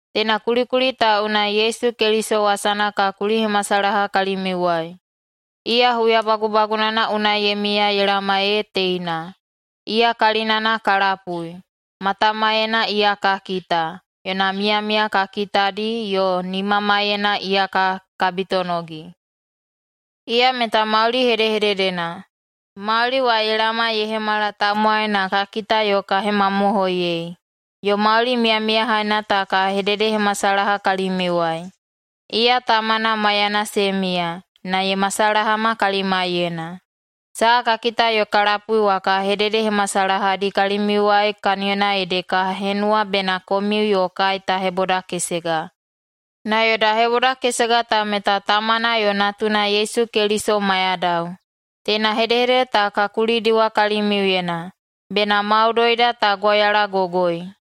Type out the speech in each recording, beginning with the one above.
Teina kulikuli ta unai Yesu Keliso wasana ka kulihemasalaha kalimiuwai. Iya huya bagubagunana unai ye miya ye laoma ee teina, iya kalinana ka lapui, matamaiyena iya ka kita, yona miyamiya ka kitadi, yo nimamaiyena iya ka kabitonogi. Iya meta Mauli Hedehededena. Mauli wa ye laoma ye hemala tamowai na ka kita yo ka hemamohoiyei, yo mauli miyamiyahaina ta ka hededehemasalaha kalimiuwai. Iya Tamana maiyana se miya, na ye masalahama kalimaiyena. Saha ka kita yo ka lapui wa ka hededehemasalahadi kalimiuwai kaniyona ede ka henuwa bena komiu yo kai ta hebodakesega. Na yoda hebodakesega ta meta Tamana yo Natuna Yesu Keliso maiyadao. Teina hedehedede ta ka kulidiwa kalimiuyena, bena maudoida ta gwauyalagogoi.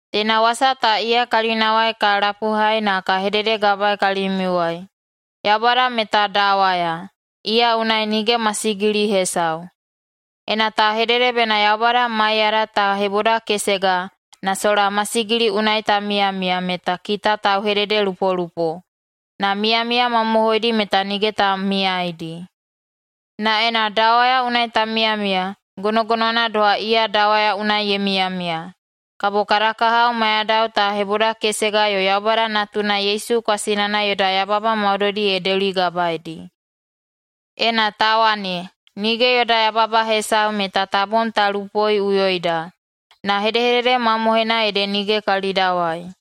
Teina wasa ta iya kalinawai ka lapuhai na ka hededegabaei kalimiuwai: Yaubada meta dawaya, iya unai nige masigili hesau. Ena ta hedede bena Yaubada maiyada ta hebodakesega, na sola masigili unai ta miyamiya, meta kita tauhededelupolupo, na miyamiya mamohoidi meta nige ta miyaeidi. Na ena dawaya unai ta miyamiya, gonogonowana doha iya dawaya unai ye miyamiya, kabo kada kahao maiyadao ta hebodakesega yo Yaubada Natuna Yesu kwasinana yoda yababa maudoidi ye deuligabaedi. Ena ta wane, nige yoda yababa hesau, meta ta bom ta lupoiꞌuyoida, na hedehedede mamohoina ede nige kalidawai.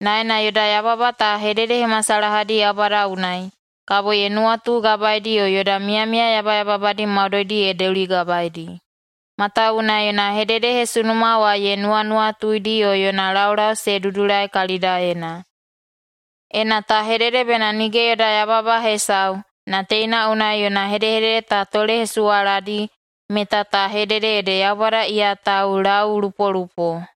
Na ena yoda yababa ta hededehemasalahadi Yaubada unai, kabo ye nuwatugabaeidi yo yoda miyamiya yabayababadi maudoidi ye deuligabaeidi, matawuwuna yona hededehesunuma wa ye nuwanuwatuidi yo yona laulau se dudulai kalidaena. Ena ta hedede bena nige yoda yababa hesau, na teina unai yona hedehedede ta tolehesuwaladi, meta ta hedede ede Yaubada iya taulaulupolupo.